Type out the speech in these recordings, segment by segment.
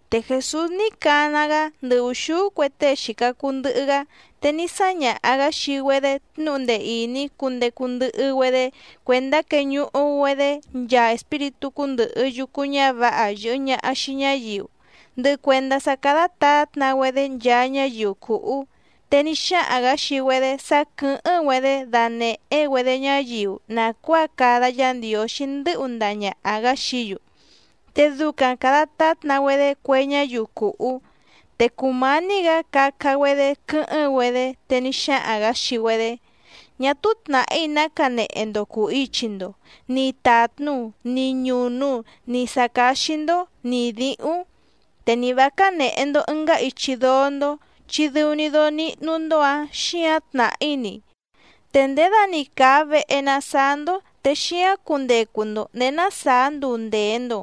Te Jèsús ní cana‑gá ndɨ ùxúú cue tée xìca cuu ndɨhɨ‑gá, te ní sáñaha‑gǎ xii‑güedé tnúhu ndee ìní cundecu ndɨhɨ‑güedé cuèndá queñuhu‑güedé nchaa espíritú cúndɨ̀hɨ yucu ñávǎha yɨ̀hɨ ñaha xii ñáyiu, ndɨhɨ cuèndá sá cádá tǎtna‑güedé nchaa ñáyiu cùhú. Te ní xáhaⁿ‑gǎ xii‑güedé sá quɨ̀hɨ́ⁿ‑güedé danèhé‑güedé ñáyiu nàcuáa cada Yá Ndiǒxí ndɨ́hu ndaha ñàha‑gá xií‑yu, te ducaⁿ càda tátna‑güedé cue ñáyiu cùhú. Te cùmání‑gǎ caca‑güedé quɨ́hɨ́ⁿ‑güedé, te ní xáhaⁿ‑gǎ xii‑güedé: —Ñá túú tnàhí ná canehe‑ndo cùu ichi‑ndo, ni tàtnu, ni ñùnu, ni sǎ cáxí‑ndó, ni dǐhúⁿ. Te ni vǎ cánèhe‑ndo ɨngá ichi dóó‑ndó, chi dɨu‑ni dóó níhnú‑ndó‑ǎⁿ xíǎⁿ tnàhí‑ni. Te ndědani càa vehe na saá‑ndó, te xíáⁿ cundecu‑ndo ndèé ná sàá nduu ndèe‑ndo.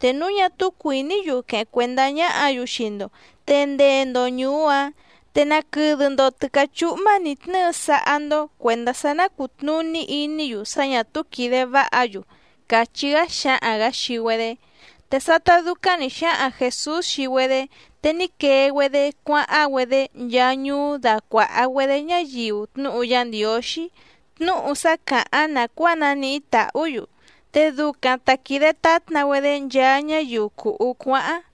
Te núu ñá túú cuìní‑yu queheⁿ cuèndá ñáhǎ‑yu xii‑ndo, te ndee‑ndo ñùú‑áⁿ, te naquɨdɨ‑ndo tɨ̀cá chúhmá nǐ tnɨ́ɨ sáhá‑ndó cuèndá sá ná cùtnuní iní‑yu sá ñà túú quìde váha‑yu —càchí‑gá xáhaⁿ‑gǎ xii‑güedé. Te sátá dúcáⁿ nǐ xáhaⁿ Jèsús xii‑güedé, te ní quee‑güedé cuáháⁿ‑güedé nchaa ñuú dácuàha‑güedé ñáyiu tnúhu Yá Ndiǒxí, tnúhu sá càháⁿ nàcuáa naníhí tàhú‑yu, te ducaⁿ ta quìde tátna‑güedé nchaa ñáyiu cùhú cuáháⁿ.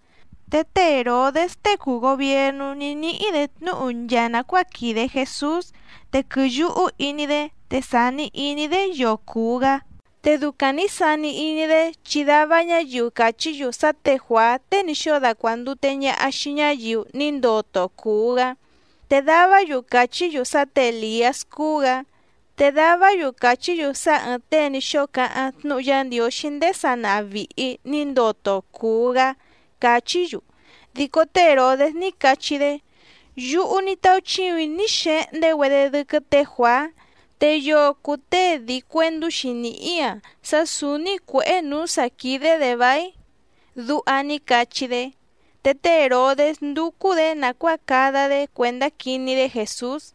Te té Hèrodés tée cùu gobiernú ní níhí‑dě tnúhu nchaa nàcuáa quìde Jesús, te quɨ̀yuhú iní‑dé te sàni iní‑dé yoo cùu‑gá. Te ducaⁿ nǐ sani iní‑dé chi dava ñáyiu càchí‑yu sá tě Juàá tée ní xóo dacuàndute ñaha xii ñáyiu ní ndoto cùu‑gá. Te davá‑yu càchí‑yu sá tě Èliás cúú‑gǎ, te davá‑yu càchí‑yu sá ɨ̀ɨⁿ tée ní xóo cáháⁿ tnúhu Yá Ndiǒxí ndéé sanaha vìhi ní ndoto cùu‑gá, càchí‑yu. Dico té Hèrodés ní cachí‑dé: —Yúhú ní táúchíùⁿ‑í ní xehndé‑güedé dɨ́quɨ́ tě Juàá. ¿Te yoo cùu tée dii cuèndú‑xi nìhí‑a sá sǔúní cuěhé nǔú sǎ quídé‑dě váíⁿ? —duha ní cachí‑dé. Te té Hèrodés ndúcú‑dě nàcuáa cada‑dé cuèndá quiní‑dé Jèsús.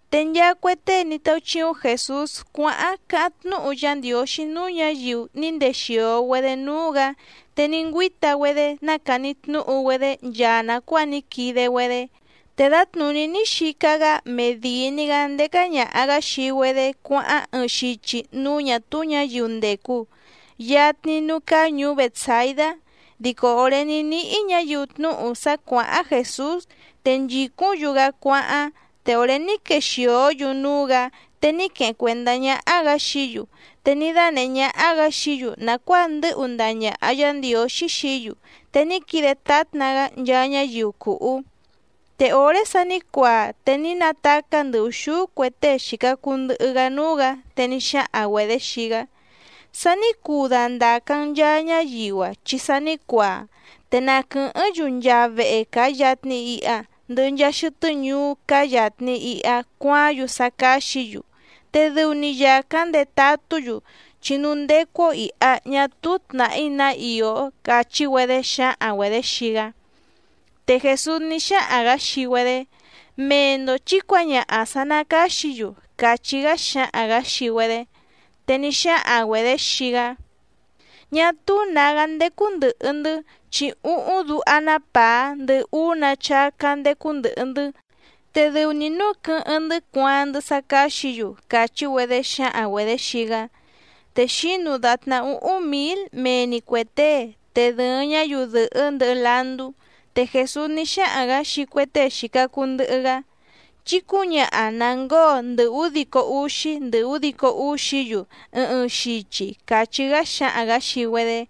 Te nchaa cue tée ní táúchíúⁿ Jèsús cuáháⁿ cáháⁿ tnúhu Yá Ndiǒxí núú ñǎyiu ní ndexìo‑güedé núú‑gǎ te ní ngüíta‑güedé nácàni tnúhu‑güedé nchaa nàcuáa ní quide‑güedé. Te dǎtnùní ní xica‑gá medìi‑ni‑gá ndécá ñàha‑gá xii‑güedé cuáháⁿ ɨɨⁿ xichi núú ñà túú ñǎyiu ndècu, yatni núú cáá ñùú Bètsaidá. Dico òré ní níhí ñǎyiu tnúhu sá cuàháⁿ Jèsús, te nchìcúⁿ‑yu‑gá cuáháⁿ, te òré ní quexìó‑yu núú‑gǎ, te ní queheⁿ cuèndá ñáhá‑gǎ xií‑yu, te ní dánèhé ñáhá‑gǎ xií‑yu nàcuáa ndɨ́hu ndaha ñàha Yá Ndiǒxí xií‑yu, te ní quide tátna‑gá nchaa ñáyiu cùhú. Te òré sa ní cuaa te ní natacá ndɨ ùxúú cue tée xìca cuu ndɨhɨ‑gá núú‑gǎ, te ní xáhaⁿ‑güedě xii‑gá: —Sa ní cuu dandàca‑n nchaa ñáyiu‑a, chi sa ní cuaa, te na quɨ̀hɨ́ⁿ‑yu nchaa vehe càa yatni iha, ndɨhɨ nchaa xɨtɨ́ ñuú cáá yàtni iha cuaáⁿ‑yu sá cáxǐ‑yu, te dɨu‑ni yàcáⁿ ndetatú‑yu, chi núú ndécú‑ó ìha ñá túú tnàhí ná ìó —càchí‑güedé xǎhaⁿ‑güedě xii‑gá. Te Jèsús ní xáhaⁿ‑gǎ xii‑güedé: —Mee‑ndo chǐ cuǎñaha sǎ ná càxí‑yu —càchí‑gá xáhaⁿ‑gǎ xii‑güedé. Te ní xáhaⁿ‑güedě xii‑gá: —Ñá túú nǎgá ndécú ndɨ̀hɨ‑ndɨ́, chi úhúⁿ duha‑ná pàá, ndɨhɨ úú‑nǎ chácá ndécú ndɨ̀hɨ‑ndɨ́, te dɨu‑ni núu quɨ́hɨ́ⁿ‑ndɨ́ cuaaⁿ‑ndɨ́ sá cáxǐ‑yu —càchí‑güedé xǎhaⁿ‑güedě xii‑gá. Te xǐnu dàtná úhúⁿ mǐl mee‑ni cuè tée, te dɨ̀ɨⁿ ñáyiu dɨ̀hɨ́ ndɨhɨ landú. Te Jèsús ní xáhaⁿ‑gǎ xii cue tée xìca cuu ndɨhɨ‑gá: —Chí cǔñaha na ngǒo ndɨ údico úxí ndɨ údico úxí‑yu ɨɨⁿ ɨɨⁿ xichi —càchí‑gá xáhaⁿ‑gǎ xii‑güedé.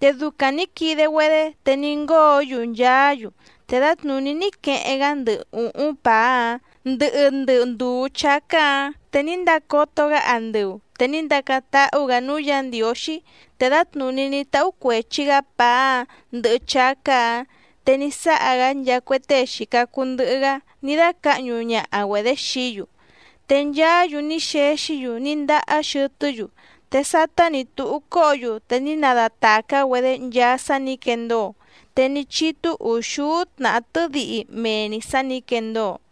Te ducaⁿ nǐ quide‑güedé, te ní ngóo‑yu nchaá‑yu. Te dǎtnùní ní queheⁿ‑gá ndɨ ùhúⁿ pàá‑áⁿ, ndɨhɨ ndɨ ndùú chácá‑ǎⁿ. Te ní ndacoto‑gá andɨu, te ní ndacáⁿ táhú‑gǎ núú Yǎ Ndiǒxí, te dǎtnùní ní táhú cuèchi‑gá pàá‑áⁿ ndɨhɨ chácá‑ǎⁿ, te ní sáha‑gá nchaa cue tée xìca cuu ndɨhɨ‑gá ní dácǎhñu ñaha‑güedě xií‑yu. Te nchaá‑yu ní xexí‑yu ní ndahá xɨtɨ́‑yu. Te sátá nǐ túhú cóhǒ‑yu te ní nadatàcá‑güedé nchaa sá nǐ quendóo, te ní chítú ùxúú tnàhá tɨ́dihi mee‑ni sǎ nǐ quendóo.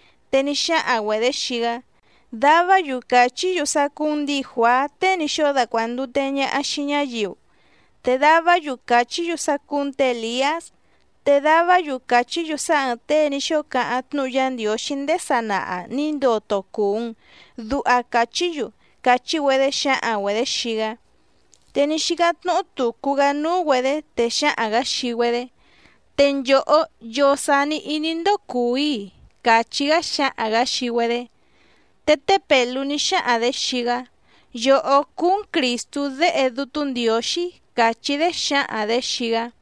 Te ní xáhaⁿ‑güedě xii‑gá: —Davá‑yu càchí‑yu sá cúú‑n ndǐi Juàá tée ní xóo dacuàndute ñaha xii ñáyiu, te davá‑yu càchí‑yu sá cúú‑n tě Èliás, te davá‑yu càchí‑yu sá ɨ̀ɨⁿ tée ní xóo cáháⁿ tnúhu Yá Ndiǒxí ndéé sanaha nǐ ndoto cùu‑n, duha càchí‑yu —càchí‑güedé xǎhaⁿ‑güedě xii‑gá. Te ní xícáⁿ tnúhú tùcu‑gá núú‑güedě, te xáhaⁿ‑gǎ xii‑güedé: —Te nchòhó, ¿yoo sàni iní‑ndó cùu‑í‑i? —càchí‑gá xáhaⁿ‑gǎ xii‑güedé. Te té Pèlú ní xáhaⁿ‑dě xii‑gá: —Yòhó cúú‑n Crìstú Déhe Dútú Ndiǒxí —càchí‑dé xǎhaⁿ‑dě xii‑gá.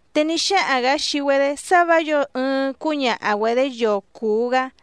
Te ní xáhaⁿ‑gǎ xii‑güedé sá vǎ yǒo ɨɨⁿ cúñaha‑güedě yoo cùu‑gá.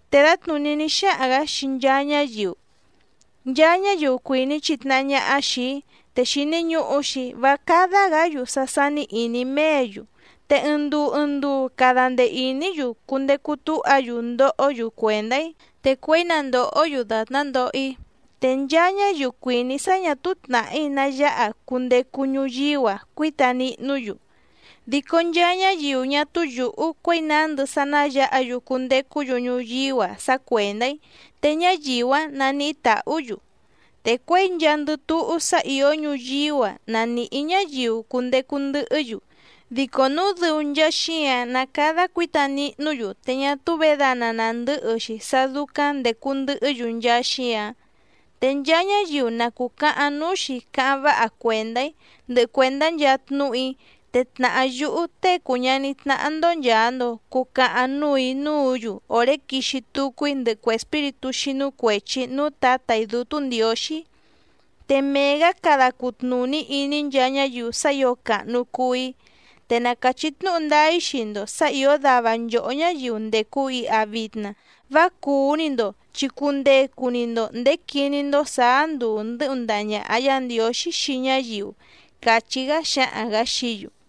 Te dǎtnùní ní xáhaⁿ‑gǎ xii nchaa ñáyiu: —Nchaa ñáyiu cuìní chitnahá ñáhá xìi‑í, te xìni ñuhu‑xi vá cádá‑gǎ‑yu sá sání ìní méě‑yu, te ɨɨⁿ nduu ɨɨⁿ nduu cada ndee ìní‑yu cundecu túha‑yu ndohó‑yu cuèndá‑í, te cuěi na ndòhó‑yu dàtná ndoho‑í. Te nchaa ñáyiu cuìní sá ñà túú tnàhí ná yáha cundecu ñuyíú‑a cuíta nihnú‑yu. Dico nchaa ñáyiu ñá túú yùhú cuěi nándɨ sá ná yǎha‑yu cundecú‑yu ñuyíú‑a sá cuèndá‑í, te ñáyiu‑áⁿ naníhí tàhú‑yu. Te cuěi nchaandɨ túhú sá ìó ñuyíú‑a na nìhí ñáyiu cundecu ndɨhɨ́‑yu, dico núu dɨu nchaa xíǎⁿ ná càda cuíta nihnú‑yu te ñá túú vědana nàndɨ́hɨ‑xi sá dúcáⁿ ndècu ndɨhɨ́‑yu nchaa xíǎⁿ. Te nchaa ñáyiu na cùcahaⁿ núú‑xi cáháⁿ váha cuèndá‑í ndɨhɨ cuèndá nchaa tnúhu‑í, te tnàhá yúhú Tée cùu ñaní tnáhá‑ndó nchàa‑ndo cucahaⁿ núù‑í núǔ‑yu òré quixi tucu‑í ndɨhɨ cue espíritú xínú cuèchi núú Tǎtà‑í Dútú Ndiǒxí, te mee‑gǎ cada cutnùní iní nchaa ñáyiu sá ǐo càhnu cuu‑í. Te na càchí tnúhu ndáá‑í xii‑ndo sǎ ìó dava nchòhó ñáyiu ndècu iha vitna vá cùú‑ni‑ndo, chi cundecu‑ni‑ndo nděé quiní‑ndó sǎá nduu ndɨ́hu ndaha ñàha Yá Ndiǒxí xii ñáyiu —càchí‑gá xáhaⁿ‑gǎ xií‑yu.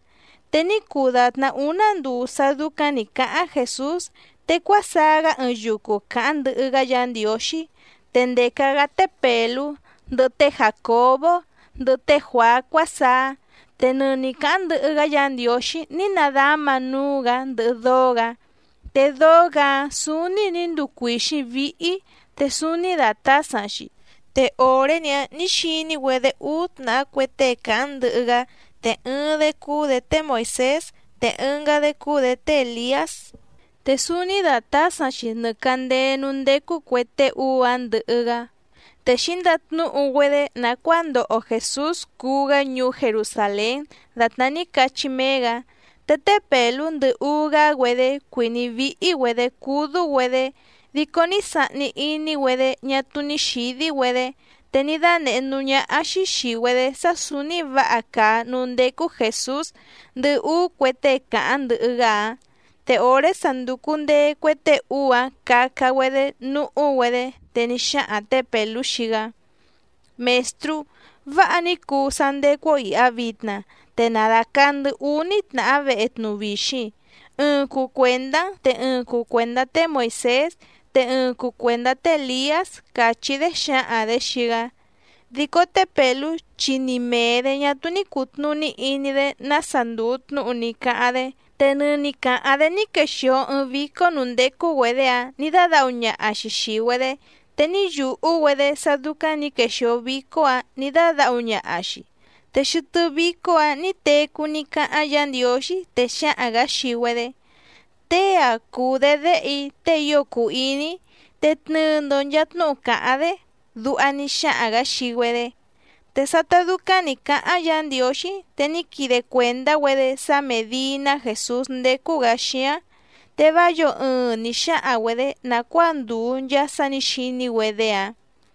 Te ní cuu dàtná úná nduu sá dúcáⁿ nǐ cáháⁿ Jèsús, te cuásaá‑gá ɨɨⁿ yucu cáháⁿ ndɨhɨ‑gá Yǎ Ndiǒxí, te ndèca‑gá té Pèlú, ndɨhɨ té Jàcobó, ndɨhɨ té Juàá cuásaá. Te nɨni càháⁿ ndɨhɨ‑gá Yǎ Ndiǒxí ní nadáma núú‑gǎ ndɨhɨ dóó‑gǎ, te dóó‑gǎ‑áⁿ sǔúní nǐ nduu cuìxíⁿ víhí, te súúní dàtásaⁿ‑xi. Te òré‑ni‑áⁿ nǐ xiní‑güedé úú tnàhá cue tée càháⁿ ndɨhɨ‑gá, te ɨɨⁿ‑dé cúú‑dě té Moìsés, te ɨngá‑dé cúú‑dě té Èliás, te súúní dàtásaⁿ‑xi nɨ càndéé núú ndécú cuè tée úú‑áⁿ ndɨhɨ‑gá, te xǐndatnúhu‑güedé nàcuáa ndoho Jèsús cuú‑gá ñuú Jerusàlén dàtná ní cachí méé‑gǎ. Te té Pèlú ndɨhɨ úú‑gá‑güedé cuìní víhí‑güedě cúdú‑güedé, dico ní sahni iní‑güedé ñá túú ní xǐdí‑güedé, te ní dánèhé núú ñáhá‑xí xìi‑güedé sá sǔúní vǎha càa núú ndécú Jèsús, ndɨhɨ úú cue tée càháⁿ ndɨhɨ‑gá‑áⁿ. Te òré sa ndùcu ndee cue tée úú‑áⁿ caca‑güedé núhú‑güedé, te ní xáhaⁿ tě Pèlú xii‑gá: —Mèstrú, ¡váha ní cuu sá ndécú‑ó ìha vitna! Te na dàcaa‑ndɨ́ úní tnàhá vehe tnuvixiⁿ, ɨɨⁿ cuu cuèndá‑n, te ɨɨⁿ cuu cuèndá té Moìsés, te ɨɨⁿ cuu cuèndá té Èliás —càchí‑dé xǎhaⁿ‑dě xii‑gá. Dico té Pèlú chi ni mèe‑dé ñá túú ní cùtnuní iní‑dé nása ndùu tnúhu ní cáháⁿ‑dé. Te nɨni càháⁿ‑dé ní quexìo ɨɨⁿ vícó nǔú ndécú‑güedě‑áⁿ nǐ dádǎhu ñaha‑xi xìi‑güedé, te ní yùhú‑güedé sá dúcáⁿ nǐ quexìo vícó‑ǎⁿ nǐ dádǎhu ñaha‑xi. Te xɨtɨ́ vícó‑ǎⁿ nǐ tecú ní cáháⁿ Yǎ Ndiǒxí, te xáhaⁿ‑gǎ xii‑güedé: —Tée‑a cùu‑dé Déhe‑í, tée ío cùu iní‑í, te tnɨɨ‑ndo nchàa tnúhu càháⁿ‑dé —duha ní xáhaⁿ‑gǎ xii‑güedé. Te sátá dúcáⁿ nǐ cáháⁿ Yǎ Ndiǒxí, te ní quide cuèndá‑güedé sá mèdii‑ná Jèsús ndécú‑gǎ xíáⁿ. Te vá yǒo ɨɨⁿ nǐ xáhaⁿ‑güedě nàcuáa ndùu nchaa sá nǐ xiní‑güedé‑áⁿ.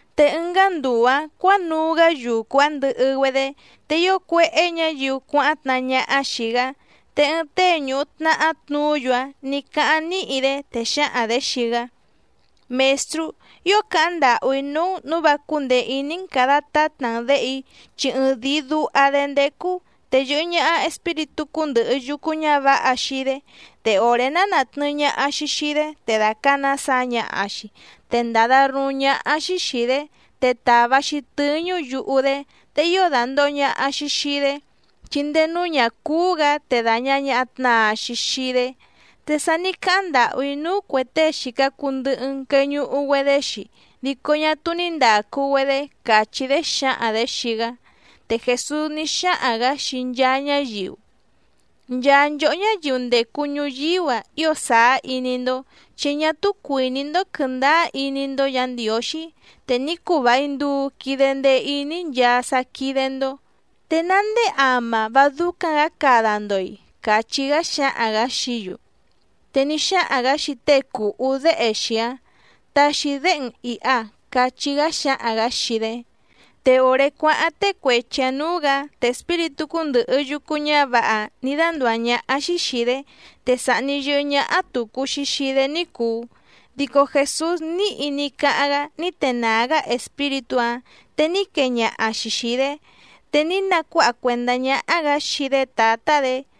Te ɨngá nduu‑ǎⁿ cuǎnuu‑gá yucu‑áⁿ ndɨhɨ‑güedé, te ío cuéhé ñǎyiu cuáháⁿ tnahá ñáhá xìi‑gá. Te ɨɨⁿ tée ñùhu tnahá tnuú‑yu‑áⁿ nǐ cáháⁿ níhi‑dé, te xǎhaⁿ‑dě xii‑gá: —Mèstrú, ío càháⁿ ndàhú‑í núú‑n nǔu vá cúndèe iní‑n càda tátna‑n děhe‑í, chi ɨɨⁿdìi duha‑dé ndécú, te yɨ̀hɨ ñaha espíritú cúndɨ̀hɨ yucu ñávǎha xii‑dé, te òré ná nàtnɨɨ ñaha‑xi xii‑dé, te dàcana saa ñaha‑xi, te ndàda ruúⁿ ñáhá‑xí xìi‑dé, te tàva‑xi tɨ́ñú yuhu‑dé. Te ío dàndoho ñaha‑xi xii‑dé, chi ndéé núú ñà cúú‑gǎ, te dàña ñaha tnaa‑xi xii‑dé. Te sa ní cáháⁿ ndàhú‑í núú cuè tée xìca cuu ndɨhɨ‑n queñuhu‑güedé‑xi, dico ñá túú ní ndàcu‑güedé —càchí‑dé xǎhaⁿ‑dě xii‑gá. Te Jèsús ní xáhaⁿ‑gǎ xii nchaa ñáyiu: —¡Nchaa nchòhó ñáyiu ndècu ñuyíú‑a ío sàá iní‑ndó, chi ñá túú cuìní‑ndó quɨ̀ndáá iní‑ndó Yǎ Ndiǒxí! Te ní cuu vài nduu quide ndee iní‑í nchaa sá quídé‑ndó, ¿te ná ndéé ama vá dúcáⁿ‑gǎ cada‑ndo‑i? —càchí‑gá xáhaⁿ‑gǎ xií‑yu. Te ní xáhaⁿ‑gǎ xii tée cùhú déhe‑xi‑áⁿ: —Taxi déhe‑n ìha —cachí‑gá xáhaⁿ‑gǎ xii‑dé. Te òré cuáháⁿ tée cuechi‑ǎⁿ nǔú‑gǎ, te espíritú cúndɨ̀hɨ yucu ñávǎha‑áⁿ nǐ dándùá ñáhá‑xí xìi‑dé, te sàhni yɨhɨ́ ñáhá tùcu‑xi xii‑dé ní cùu, dico Jèsús níhi ní cáháⁿ‑gá ní tenàá‑gá espíritú‑áⁿ, te ní quee ñaha‑xi xìi‑dé, te ní nacuáha cuèndá ñáhá‑gǎ xii‑dé tǎtá‑dě.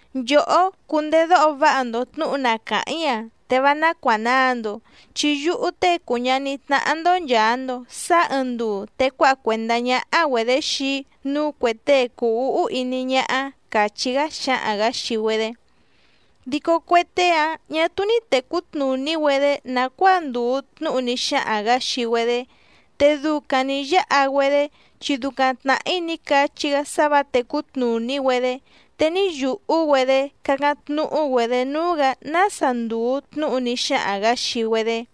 —Nchòhó cundedóho váha‑ndo tnǔhu na càháⁿ‑í‑a, te vá ná cuànaa‑ndo, chi yúhú Tée cùu ñaní tnáhá‑ndó nchàa‑ndo sáá ɨɨⁿ nduu te cuáha cuèndá ñáhá‑güedě xii‑í núú cuè tée cùu úhú iní ñáhá —càchí‑gá xáhaⁿ‑gǎ xii‑güedé. Dico cue tée‑áⁿ ñà túú ní tècú tnùní‑güedé nàcuáa ndùu tnúhu ní xáhaⁿ‑gǎ xii‑güedé, te ducaⁿ nǐ yáha‑güedé, chi ducaⁿ tnàhí ní cachí‑gá sá vǎ tècú tnùní‑güedé, te ní yùhú‑güedé cácáⁿ tnúhú‑güedě núú‑gǎ nása ndùu tnúhu ní xáhaⁿ‑gǎ xii‑güedé.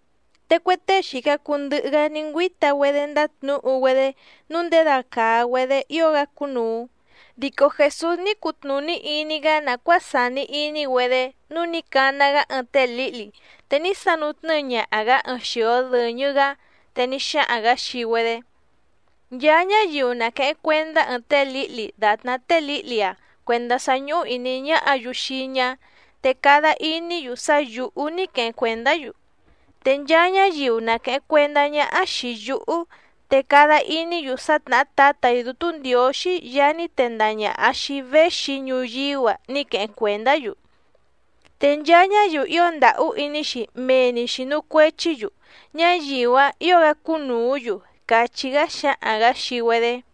Te cue tée xìca cuu ndɨhɨ‑gá ní ngüíta‑güedé ndátnǔhu‑güedé nǔu ndědacàa‑güedé ío‑gá cúnùu, dico Jèsús ní cutnùní iní‑gá nàcuáa sàni iní‑güedé nǔu ní cana‑gá ɨɨⁿ té lǐhli, te ní sanu tnɨ́ɨ ñaha‑gǎ ɨɨⁿ xio dɨ̀ñɨ‑gá. Te ní xáhaⁿ‑gǎ xii‑güedé: —Nchaa ñáyiu na quèheⁿ cuendá ɨɨⁿ té lǐhli dàtná té lǐhli‑a cuèndá sá ñúhú ìní ñáhǎ‑yu xii‑í ñá, te cada iní‑yu sá yǔhú ní queheⁿ cuèndá‑yu, te nchaa ñáyiu na quèheⁿ cuendá ñáhá xìi yúhú, te cada iní‑yu sá tnàhá Tǎtà‑í Dútú Ndiǒxí Yaá ní tendaha ñàha xii‑í véxi‑í ñuyíú‑a ní queheⁿ cuèndá‑yu. Te nchaa ñáyiu ío ndàhú iní‑xi mee‑ni xìnu cuechí‑yu, ñáyiu‑áⁿ ǐo‑gá cúnùú‑yu —càchí‑gá xáhaⁿ‑gǎ xii‑güedé.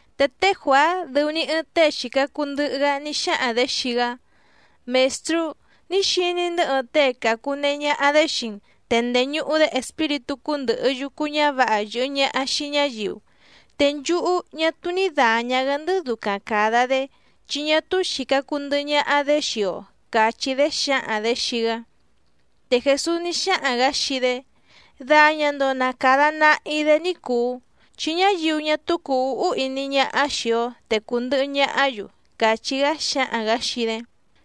Te té Juàá dɨu‑ni ɨɨⁿ tée xìca cuu ndɨhɨ‑gá ní xáhaⁿ‑dě xii‑gá: —Mèstrú, ní xiní‑ndɨ́ ɨɨⁿ tée càcunehe ñaha‑dé xii‑n, te ndèñuhu‑dé espíritú cúndɨ̀hɨ yucu ñávǎha yɨ̀hɨ ñaha xii ñáyiu, te nchúhú ñá túú ní dàña‑gá‑ndɨ́ ducaⁿ càda‑dé, chi ñá túú xìca cuu ndɨhɨ ñaha‑dé xii‑o —càchí‑dé xǎhaⁿ‑dě xii‑gá. Te Jèsús ní xáhaⁿ‑gǎ xii‑dé: —Daña‑ndo na càda nahi‑dé ní cùu, chi ñáyiu ñá túú cùu úhú iní ñáhá xìi‑o te cùndɨhɨ ñahá‑yu —càchí‑gá xáhaⁿ‑gǎ xii‑dé.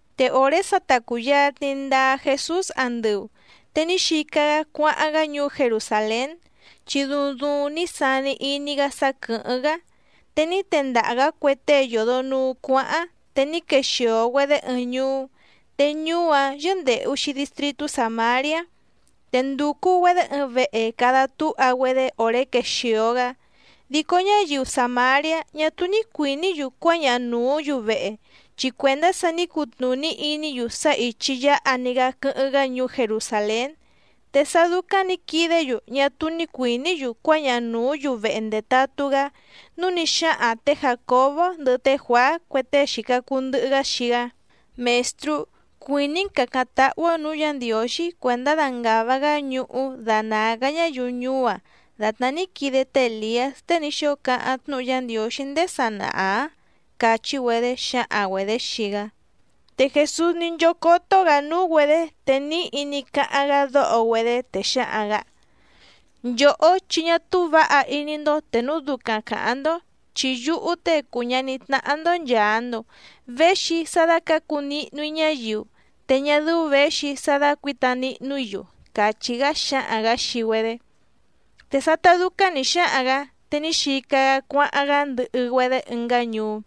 Te òré sa ta cùyatni ndaa Jesús andɨu, te ní xica‑gá cuáháⁿ‑gá ñuú Jerusàlén, chi duuⁿ duuⁿ ní sani iní‑gá sá quɨ̀hɨ́ⁿ‑gá. Te ní tendaha‑gǎ cue tée yòdo nuu cuáháⁿ, te ní quexìo‑güedé ɨɨⁿ ñuú, te ñuú‑áⁿ yɨ́ndèhu‑xi distritú Sàmariá, te ndùcu‑güedé ɨɨⁿ vehe cada túha‑güedé òré quexìo‑gá. Dico ñáyiu Sàmariá ñá túú ní cuìní‑yu cuáñaha nùú‑yu vehe, chi cuèndá sá nǐ cutnùní iní‑yu sá ìchi yáha‑ni‑gá quɨ́hɨ́ⁿ‑gá ñuú Jerusàlén. Te sá dúcáⁿ nǐ quidé‑yu ñá túú ní cuìní‑yu cuáñaha nùú‑yu vehe ndetatú‑gá, núu ní xáhaⁿ tě Jàcobó ndɨhɨ té Juàá cue tée xìca cuu ndɨhɨ‑gá xii‑gá: —Mèstrú, ¿cuìní‑n càcáⁿ táhú‑ó nǔú Yǎ Ndiǒxí cuèndá dangàva‑gá ñuhú danàa‑gá ñáyiu ñuú‑a dàtná ní quide té Èliás tée ní xóo cáháⁿ tnúhu Yá Ndiǒxí ndéé sanaha‑ǎⁿ? —càchí‑güedé xǎhaⁿ‑güedě xii‑gá. Te Jèsús ní nchócótó‑gǎ núú‑güedě, te níhi ní cáháⁿ‑gá dóho‑güedé, te xáhaⁿ‑gǎ: —Nchòhó, chi ñá túú vǎha iní‑ndó te núu ducaⁿ càháⁿ‑ndó. Chi yúhú Tée cùu ñaní tnáhá‑ndó nchàa‑ndo véxi‑í sá dácǎcu nihnu‑í ñáyiu, te ñá dɨ́ú věxi‑í sá dácuǐta nihnu‑í‑yu —càchí‑gá xáhaⁿ‑gǎ xii‑güedé. Te sátá dúcáⁿ nǐ xáhaⁿ‑gǎ, te ní xica‑gá cuáháⁿ‑gá ndɨhɨ‑güedé ɨngá ñuú.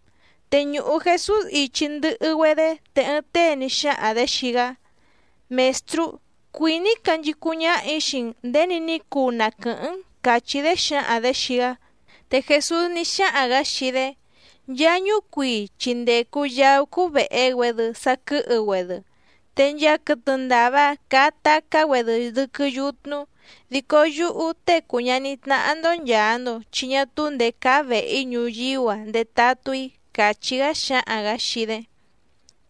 Te ñùhu Jesús ichi ndɨhɨ‑güedé, te ɨɨⁿ tée ní xáhaⁿ‑dě xii‑gá: —Mèstrú, cuìní‑í canchicúⁿ ñáhà‑í xii‑n nděni ní cuu na quɨ̀hɨ́ⁿ‑n —càchí‑dé xǎhaⁿ‑dě xii‑gá. Te Jèsús ní xáhaⁿ‑gǎ xii‑dé: —Nchaa ñúcuii chi ndècu yaú cúú vèhe‑güedɨ saquɨhɨ‑güedɨ, te nchaa quɨtɨ ndàva caa tacá‑güedɨ dɨ́quɨ́ yutnu, dico yúhú Tée cùu ñaní tnáhá‑ndó nchàa‑ndo chi ñá túú ndèé cáá vèhe‑í ñuyíú‑a ndetatú‑í —càchí‑gá xáhaⁿ‑gǎ xii‑dé.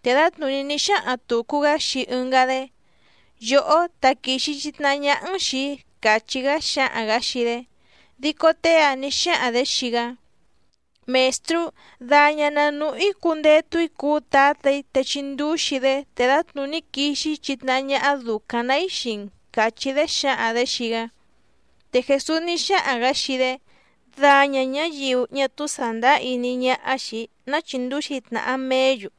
Te dǎtnùní ní xáhaⁿ tùcu‑gá xii ɨngá‑dé: —Yòhó taquìxi chitnahá ñáhá‑n xìi‑í —càchí‑gá xáhaⁿ‑gǎ xii‑dé. Dico tée‑áⁿ nǐ xáhaⁿ‑dě xii‑gá: —Mèstrú, daña na nùhú‑í cundetu‑í cuú tǎtà‑í te chindúxi‑í‑dé, te dǎtnùní quixi‑í chitnahá ñáhá dùcaⁿ‑ná‑í xii‑n —càchí‑dé xǎhaⁿ‑dě xii‑gá. Te Jèsús ní xáhaⁿ‑gǎ xii‑dé: —Daña ñǎyiu ñá túú sàndáá iní ñáhá xìi‑í ná chíndǔxi tnàha meé‑yu,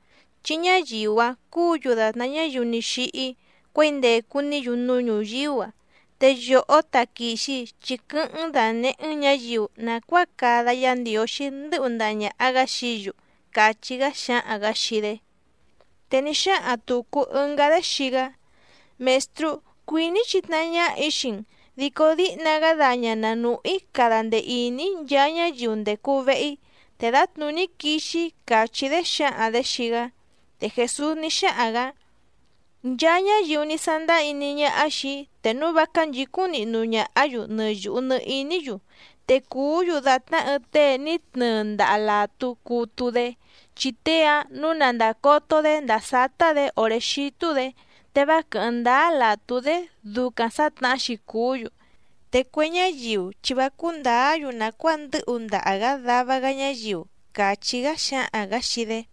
chi ñáyiu‑áⁿ cúǔ‑yu dàtná ñáyiu ní xíhí cuěi ndècu‑ní‑yu núú ñuyíú‑a. Te yòhó taquìxi, chi quɨ́hɨ́ⁿ‑n dànehé‑n ñǎyiu nàcuáa cada Yá Ndiǒxí ndɨ́hu ndaha ñàha‑gá xií‑yu —càchí‑gá xáhaⁿ‑gǎ xii‑dé. Te ní xáhaⁿ tùcu ɨngá‑dé xii‑gá: —Mèstrú, cuìní‑í chitnahá ñáhà‑í xii‑n, dico díhna‑gá daña na nùhú‑í cada ndee ìní‑í nchaa ñáyiu ndècu vehe‑í, te dǎtnùní quixi‑í —càchí‑dé xǎhaⁿ‑dě xii‑gá. Te Jèsús ní xáhaⁿ‑gǎ: —Nchaa ñáyiu ní sándáá iní ñáhá xìi‑í, te núu vá cánchǐcúⁿ nihnu ñàhá‑yu nɨ yùhu nɨ iní‑yu, te cùú‑yu dàtná ɨɨⁿ tée ní tnɨɨ ndaha làtú cutu‑dé, chi tée‑áⁿ nǔu na ndàcoto‑dé ndàa sátá‑dě òré xítú‑dě, te vá quɨ̀hɨ́ⁿ ndáá làtú‑dé ducaⁿ sǎtnahá‑xi cùú‑yu. Te cue ñáyiu chi vá cúú ndǎá‑yu nàcuáa ndɨ́hu ndaha‑gá dava‑gá ñáyiu— càchí‑gá xáhaⁿ‑gǎ xii‑dé.